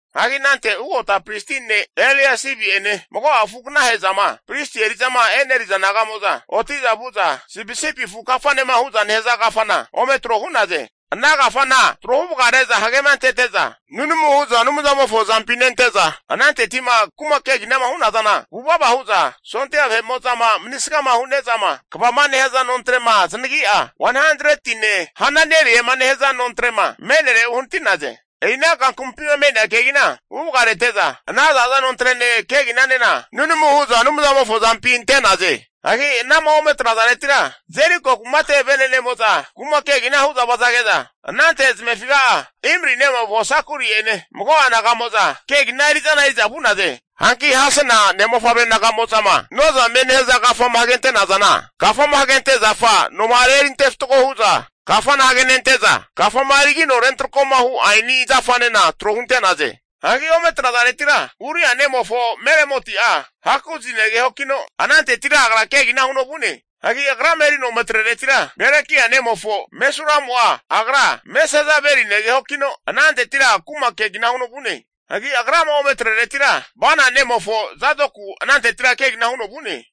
Hagi anante ugota pristi ne' Eliasibi'ene mago'a afu aganahe'zama pristi eri'zama eneriza naga'mo'za oti'za vu'za Sipisipi Afu Kafane hu'za nehaza kafana ome tro hu'naze. Ana kafana trohu vagare'za hagema antete'za, nunamu hu'za Anumzamofo azampi nente'za, ananteti'ma kuma keginama hu'nazana vuvava hu'za, sondia vahe'mo'zama manisgama hu'nezama kvama nehaza nontre'ma zanagi'a, 100tine Hananeli'ema nehaza nontre'ma me'nere uhanati'naze. E'ina kankamumpima me'nea kegina huvagarete'za, ana za'za nontrene keginanena nunamu hu'za Anumzamofo azampi ante'naze. Hagi anama ome atrazaretira Jeriko kumate vene'nemo'za kuma kegina hu'za vazage'za, anante zamefiga'a Imri nemofo Sakuri'ene mago'a naga'moza kegina eri'zana eri'za vu'naze. Hanki Hasena ne'mofavre naga'mo'zama Nozame nehaza kafama hagente'nazana, kafama hagente zafa noma'are erinte fatgo hu'za kafama hagenente'za, kafama erigino rentrakoma hu' aeni zafanena tro hunte'naze. Hagi ome atrazaretira Uria nemofo Meremoti'a Hakozi negehokino anantetira agra kegina huno vu'ne. Hagi agrama erino ome atreretira, Berekia nemofo Mesulamu'a agra Mesezabeli negehokino anantetira kuma kegina huno vu'ne. Hagi agrama ome atreretira Bana nemofo Zadoku ananteti kegina huno vu'ne.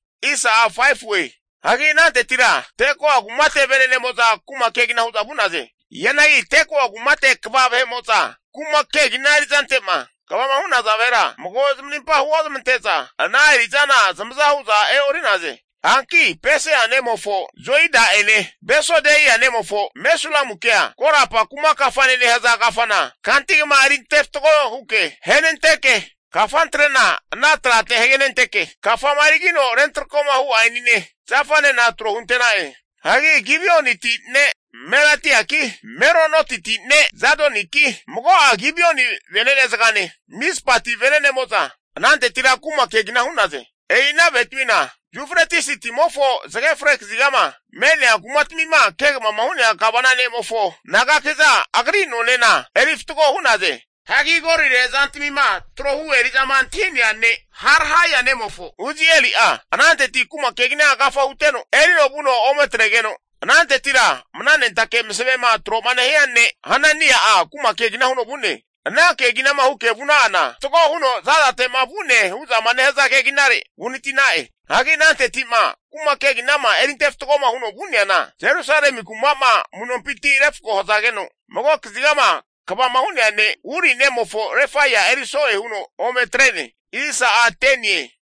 Hagi anantetira Tekoa kumate vene'nemo'za kuma kegina hu'za vu'naze. Hianagi Tekoa kumate kva vahe'mo'za kuma kegina eri'zante'ma kvama hu'naza vahera mago zamarimpa huozamante'za ana eri'zana zamaza hu'za e'ori'naze. Hanki Pesea nemofo Joida'ene Besodeia nemofo Mesulamukea, Korapa Kuma Kafane nehaza kafana kantigma eri ante fatgo huke ahenenteke kafantrena ana trate hagenenteke, kafama erigino rentrakoma hu' aenine zafanena tro hunte'na'e. Hagi Gibioniti ne' Melatiaki, Meronotiti ne' Jadoniki, mago'a Gibioni venene zagane Mizpati venenemo'za anantetira kuma kegina hu'naze. E'i ana vahetamina Yufretisi timofo zage fre kazigama me'nea kumatamima kegavama hu'nea gavana ne'mofo nagaki'za agri nonena eri fatgo hu'naze. Hagi golire zantamima trohu eri'zama antahi'nea ne' Harhaia nemofo Uzieli'a ananteti kuma kegina agafa huteno erino vuno ome atregeno, anantetira mna nentake masavema tro'ma nehia ne' Hanania'a kuma kegina huno vu'ne. Ana keginama huke vuna'ana, Fatgo huno za'zate'ma vu'ne hu'zama nehaza keginare uhanati'na'e. Hagi ananteti'ma kuma keginama eri ante fatgoma huno vu'neana, Jerusalemi kuma'ma amu'nompinti refko hazageno mago kazigama kvama hu'nea ne' Huri nemofo Refaia eri so'e huno ome atre'ne.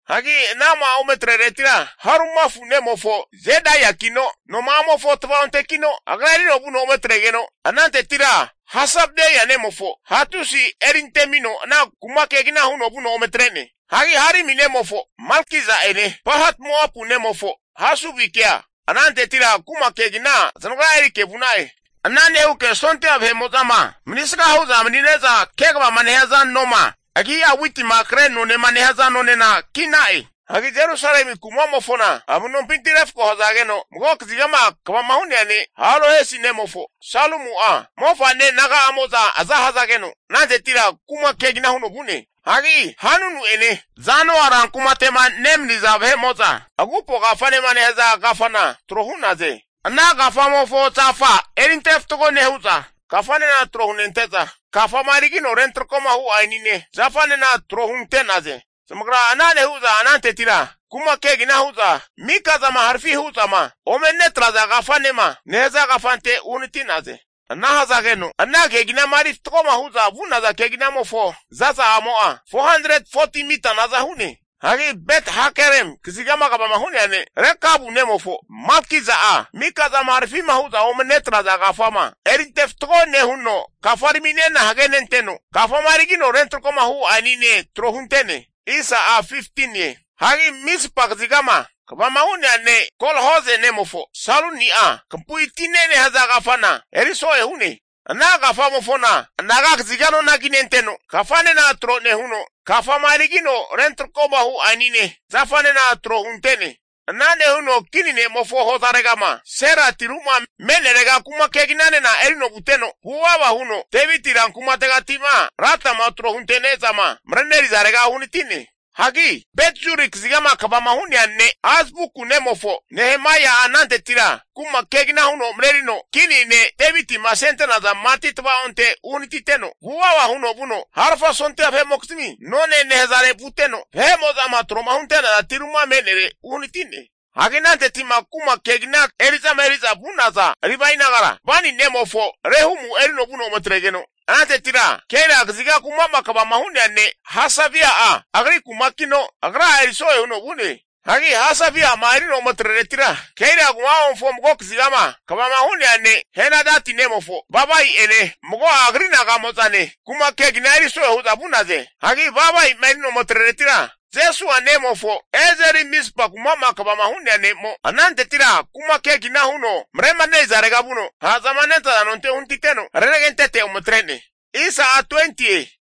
Hagi anama ome atreretira Harumafu nemofo Jedaiakino noma'amofo tvaontekino agra erino vuno ometregeno, anantetira Hasabneia nemofo Hatusi eri antemino ana kuma kegina huno vuno ome atre'ne. Hagi Harimi nemofo Malkija'ene Pahat-Moapu nemofo Hasubikea anantetira kuma kegina zanagra erike vu'na'e. Ana nehuke sondia vahe'ma manisga hu'za mani'ne'za kegavama nehaza noma agi'a Witima Kre nonema nehaza nonena ki'na'e. Hagi Jerusalemi kuma'mofona amu'nompinti refko hazageno, mago kazigama kvama hu'nea ne' Halohesi nemofo Salumu'a, mofa'ne naga'amo'za aza hazageno anantetira kuma kegina huno vu'ne. Hagi Hanunu'ene Zanoa rankumate'ma nemaniza vahe'mo'za Agupo Kafanema nehaza kafana tro hu'naze. Ana kafamofo zafa erinte fatgo nehu'za, kafanena tro hunente'za, kafama erigino rentrakoma hu' aenine zafanena tro hunte'naze. Zamagra ana nehu'za anantetira kuma kegina hu'za Mikazama Harafi hu'zama ome netraza kafanema nehaza kafante uhanati'naze. Ana hazageno ana keginama eri fatgoma hu'za vu'naza keginamofo zaza'amo'a, 440ti mita naza hu'ne. Hagi Bet-Hakerem kazigama kvama hu'nea ne' Rekabu nemofo Malkija'a, mikazama harafima hu'zama ome netraza kafama erinte fatgo nehuno kafaraminena hagenenteno, kafama erigino rentrakoma hu' aenine tro hunte'ne. Hagi Mizpa kazigama kvama hu'nea ne' Kol-Hoze nemofo Saluni'a, Kampui Tine nehaza kafana eri so'e hu'ne. Ana kafamofona anaga kaziga nona kinenteno, kafanena tro nehuno, kafama erigino rentrakoma hu' aenine zafanena tro hunte'ne. Ana nehuno kini ne'mofo hozaregama Sela tiru'ma me'nerega kuma keginanena erino vuteno, vuvava huno Deviti ran kumategati'ma latama tro hunte'nezama marenerizarega uhanati'ne. Hagi Bet-Zuri kazigama kvama hu'nea ne' Azbuku nemofo Nehemaia'a anantetira kuma kegina huno marerino kini ne' Devitima asente'naza mati tvaonte uhanatiteno, vuvava huno vuno Harfa Sondia vahe'mokizmi None nehazare vuteno, vahe'mo'zama tro'ma hunte'naza tiru'ma me'nere uhanati'ne. Hagi ananteti'ma kuma kegina eri'zama eri'za vu'naza Livae nagara, Bani nemofo Rehumu erino vuno ometregeno, anantetira Keila kaziga kuma'ma kvama hu'nea ne' Hasabia'a agri kumakino agra'a eriso'e huno vu'ne. Hagi Hasabia'ma erino ome atreretira, Keila kuma'mofo mago kazigama kvama hu'nea ne' Henadati nemofo Bavai'ene mago'a agri naga'mo'zane kuma kegina eri so'e hu'za vu'naze. Hagi Bavai'ma erino ome atreretira, Jesua nemofo Ezeri Mizpa kuma'ma kvama hu'nea ne'mo anantetira kuma kegina huno maremanerizarega vuno, ha'zama nentaza nonte uhanatiteno renagentete ome atre'ne.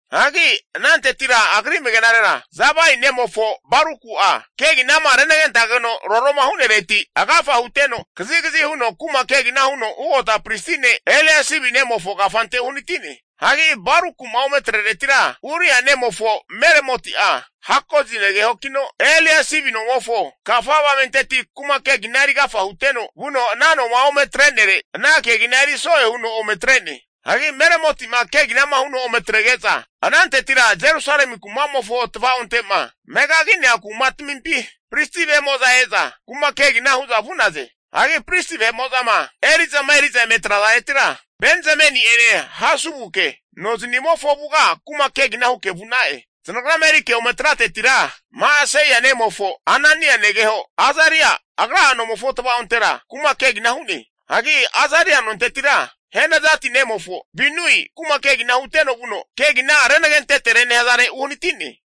Hagi anantetira agri amagenarera Zabai nemofo Baruku'a, keginama renagentageno roroma hu'nereti agafa huteno, kazikazi huno kuma kegina huno ugota pristi ne' Eliasibi nomofo kafante uhanati'ne. Hagi Baruku'ma ome atreretira Uria nemofo Meremoti'a Hakozi negehokino, Eliasibi nomofo kafa avamenteti kuma kegina eri agafa huteno vuno ana nomo'ma ome atre'nere, ana kegina eri so'e huno ome atre'ne. Hagi Meremoti'ma keginama huno ome atrege'za, anantetira Jerusalemi kumamofo tvaonte'ma megagi'nea kumatmimpi pristi vahe'mo'za e'za kuma kegina hu'za vu'naze. Hagi pristi vahe'ma eri'zama eri'za vahe'mo'za eme atrazaretira Benzamini'ene Hasubuke no zanimofo avuga kuma kegina huke vu'na'e. Zanagrama erike ome atratetira, Ma'aseia nemofo Anania negeho Azaria, agra'a nomofo tva'ontera kuma kegina hu'ne. Hagi Azaria nontetira Henadati nemofo Binui kuma kegina huteno vuno Kegina Renagentetere nehazare uhanati'ne.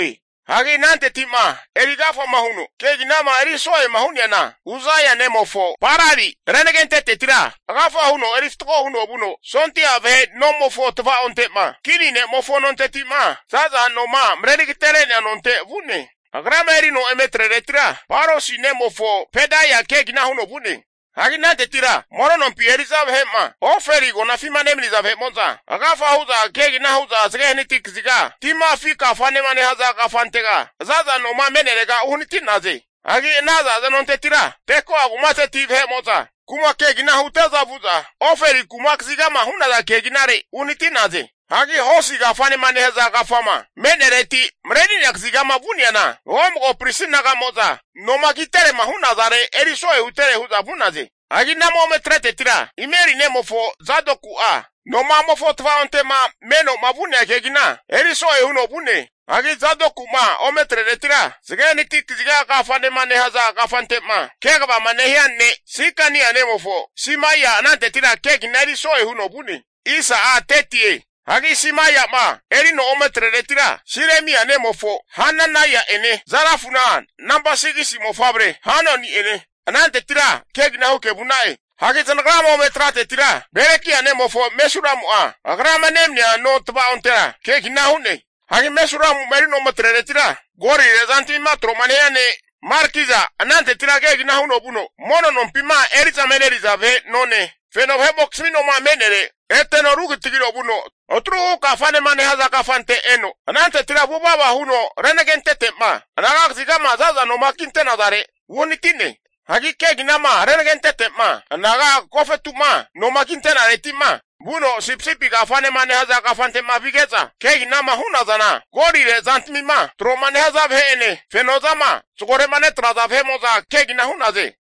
Hagi anantetima eri agafama huno keginama eri so'ema hu'neana, Uzaia nemofo Palali renagentetetira agafa huno eri fatgo huno vuno sondia vahe nomofo tavaonte'ma kini nemofo nonteti'ma za'za noma mareri agatere'nea nonte vu'ne. Agrama erino ome atreretira, Parosi nemofo Pedaia kegina huno vu'ne. Hagi anantetira mono nompi eri'za vahe'ma Ofeli agonafima nemaniza vahe'mo'za agafa hu'za kegina hu'za zage hanati kaziga Tima Afi Kafanema nehaza kafantega za'za noma me'nerega uhanati'naze. Hagi ana za'za nontetira Tekoa kumateti vahe'mo'za kuma kegina hute'za vu'za Ofeli kuma kazigama hu'naza keginare uhanati'naze. Hagi Hosi Kafanema nehaza kafama me'nereti mareri'nea kazigama vu'neana, mago mago pristi naga'mo'za noma kiterema hu'nazare eri so'e hutere hu'za vu'naze. Hagi anama ome atraretira Imeri nemofo Zadoku'a noma'amofo tvaonte'ma meno'ma vu'nea kegina eri so'e huno vu'ne. Hagi Zadoku'ma ome atreretira Zage Hanati Kaziga Kafanema nehaza kafante'ma kegavama nehia ne' Sikania nemofo Simaia anantetira kegina eri so'e huno vu'ne. Hagi Simaia'ma erino ome atreretira, Silemia nemofo Hananaia'ene Zalafuna nampa 6gis mofavre Hanuni'ene anantetira kegina huke vu'na'e. Hagi zanagrama ome atratetira Berekia nemofo Mesulamu'a agrama nemania no tvaontera kegina hu'ne. Hagi Mesulamu'ma erino ome atreretira, golire zantamima tro'ma nehia ne' Malkija anantetira kegina huno vuno, mono nompima eri'zama eneriza vahe none, feno vahe'mokizmi noma me'nere eteno rukitagino Atruhu Kafanema nehaza kafante eteno, anantetira vuvava huno renagentetema anaga kazigama za'za noma kinte'nazare uhanati'ne. Hagi keginama renagentete'ma anaga agofetu'ma noma kinte'nareti'ma vuno Sipisipi Kafanema nehaza kafante'ma vige'za keginama hu'nazana, golire zantamima tro'ma nehaza vahe'ene fenozama zagore'ma netraza vahe'mo'za kegina hu'naze.